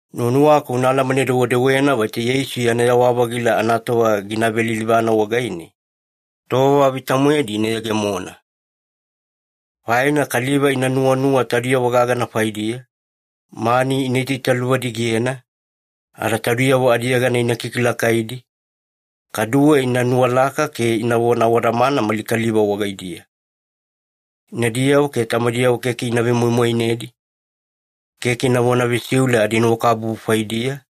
Nuwanuwaku una alamane-dewedewena vaita Yeisu yana yewa-vagila anatova gina velilivana wagaine, tova vita-moedi ina yegemona. Faina kaliva ina nuwanuwa taudiyavo gagana faidiya, mani ina itaitaluvadigena, ada taudiyavo adiyegana ina kikilakaidi, kaduwe ina nuwalaka ke inavona awadamana mali kaliva wagaidiya. Inadiyavo ke tamadiyavo keke ina vemoimoinedi, keke inavona vesiule adinuwakabubu faidiya,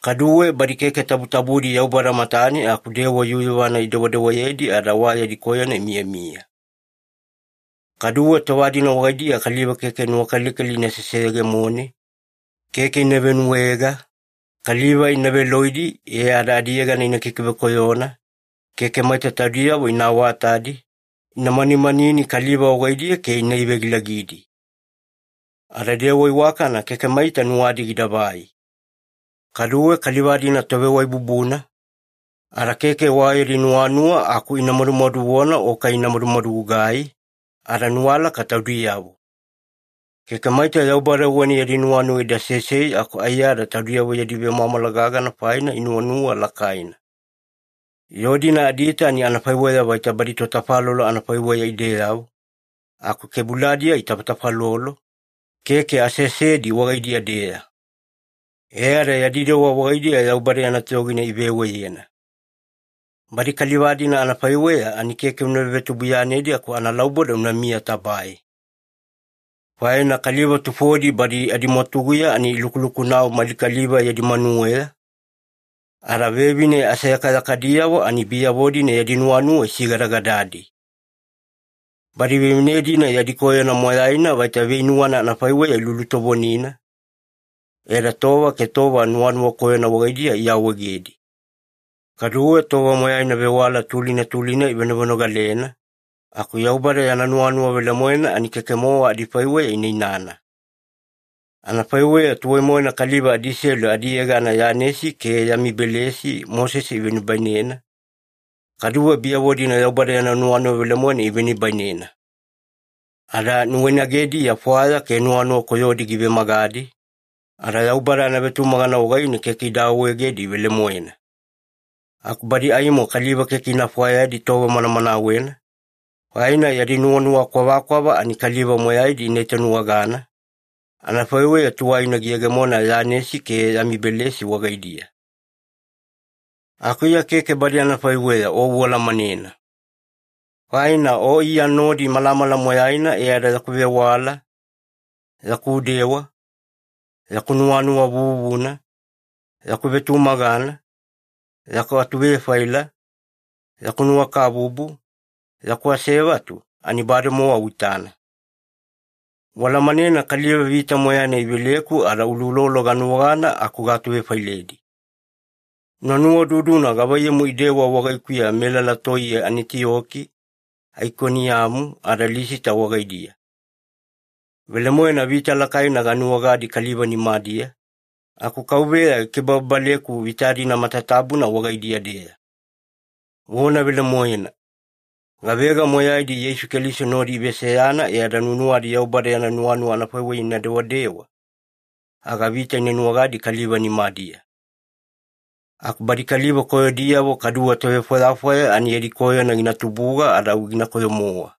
kaduwe badi keke tabutabudi Yaubada matane aku dewa yuyuvana idewadewayedi ada wa yadi koyona imiyamiya. Kaduwe tova-dina wagaidiya kaliva keke nuwakalikali ina seseyegemone, keke ina venuwaega, kaliva ina veloidi e ada adiyegana ina kikivekoyona, keke maita taudiyavo ina awatadi, ina manimanini kaliva wagaidiya ke ina ivegilagidi. Ada dewa iwakana keke maita nuwadi gidavai. Kaduwe kaliva-dina tovewaibubuna, ada keke wa yadi nuwanuwa aku ina madumaduvona o kai ina madumadugugai, ada nuwalaka taudiyavo. Keke maita Yaubada wagaine yadi nuwanuwa ida sesei aku aiyada taudiyavo yadi vemwamwala gagana faina ina nuwanuwa lakaina. Yoo-dina adiita ani anafaiweya vaita badi totafalolo anafaiweya ideyavo, aku kebuladiya itafatafalolo, keke aseasedi wagaidiya-deya. E ada yadi dewa wagaidiya Yaubada yana toyogina iveweyena. Badi kaliva-dina anafaiweya ani keke una vevetubuiyanedi aku analauboda unamiya tabae. Faina kaliva tufodi badi adimwatuguya ani ilukulukunau mali kaliva yadi manuweya, ada vevine aseyakayakadiyavo ani biyavo-dina yadi nuwanuwa isigadagadadi. Badi vevine-dina yadi koyona moyaina vaita veinuwana anafaiweya ilulutovonina, ada tova ke tova nuwanuwa koyona wagaidiya iawaegedi. Kaduwe tova moyaina vewala tulina tulina ivenovenogalena, aku Yaubada yana nuwanuwa velemoena ani keke-mowa adifaiweya ina inana. Anafaiweya tuwai-moena kaliva adiselu adiyegana Yanesi ke Yamibelesi Mosese ivenibainena, kaduwe biyavo-dina Yaubada yana nuwanuwa velemoena ivenibainena. Ada nuwainagediya fwaya ke nuwanuwa koyodi givemagadi, ada Yaubada anavetumagana wagaine keke ida awaegedi velemoena. Aku badi aimo kaliva keke ina fwayadi tova manamanawena, faina yadi nuwanuwa kwavakwava ani kaliva moyaidi ina itanuwagana, anafaiweya tuwaina giyegemona Yanesi ke Yamibelesi wagaidiya. Aku Iya keke badi anafaiweya o ualamanena. Faina o Iya nodi malamala moyaina e ada yaku vewala, yaku dewa, yaku nuwanuwa vuvuna, yaku vetumagana, yaku atuvefaila, yaku nuwakabubu, yaku asevatu, ani bademowa uitana. Ualamanena kaliva vita moyaina iveleku ada uloulolo ganuwagana aku gaatuvefailedi. Una nuwaududuna gavaiyamu idewa wagaikuya melala toiye Anitiyoki, Aikoniyamu ada Lisita wagaidiya. Velemoena vita lakaina ganuwagadi kaliva nimadiya, aku Kauveya gikibababaleku vita-dina matatabuna wagaidiya-deya. Vona velemoena, gavega moyaidi Yeisu Keliso nodi iveseyana e ada nuwanuwadi Yaubada yana nuwanuwa anafaiweya ina dewadewa, aga vita ina nuwagadi kaliva nimadiya. Aku badi kaliva koyodiyavo kaduwe tovefwayafwaya ani yadi koyona gina tubuga ada au ginakoyo-mowa.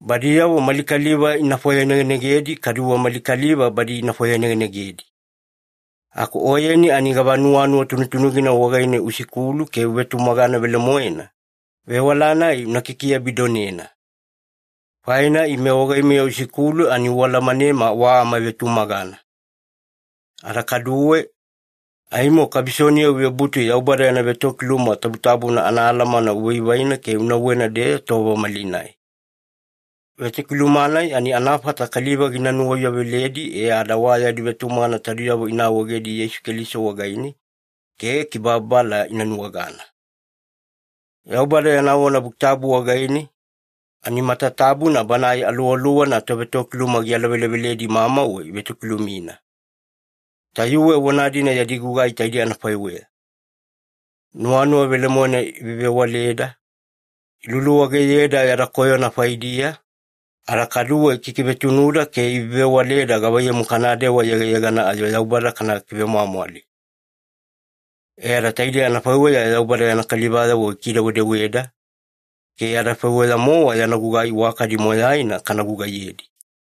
Badiyavo mali kaliva ina fwayanegenegedi kaduwe mali kaliva badi ina fwayanegenegedi. Aku oyeni ani gava nuwanuwa tunutunugina wagaine usikulu ke uvetumagana velemoena, vewala-nai una kikiabidonena. Faina ime wagaimeya usikulu ani ualamanema wa amavetumagana. Ada kaduwe, aimo kabisoniya uvebutu Yaubada yana vetokiluma tabutabuna anaalamana uvaivaina ke unauwena-deya tova malinai. Vetokiluma-nai ani anafata kaliva gina nuwauyaveledi e ada wa yadi vetumagana taudiyavo ina awaegedi Yeisu Keliso wagaine ke kibababala ina nuwagana. Yaubada yana vona Buki Tabu wagaine, ani matatabuna Banae Aluwaluwana tovetokiluma gialaveleveledi mamauwe ivetokilumina. Tayuwe vona-dina yadi gugai taidei anafaiweya. Nuwanuwa velemoena ivevewaleda, iluluwageyeda yada koyona faidiya, ada kaduwe ikikivetunuda ke ivevewaleda gavaiyamu kanadewa yegayegana ayo Yaubada kana kivemwamwali. E ada taidei anafaiweya Yaubada yana kalivayavo gikidewedeweda, ke adafaiweya-mowa yana gugai iwakadi moyaina kana gugaiyedi.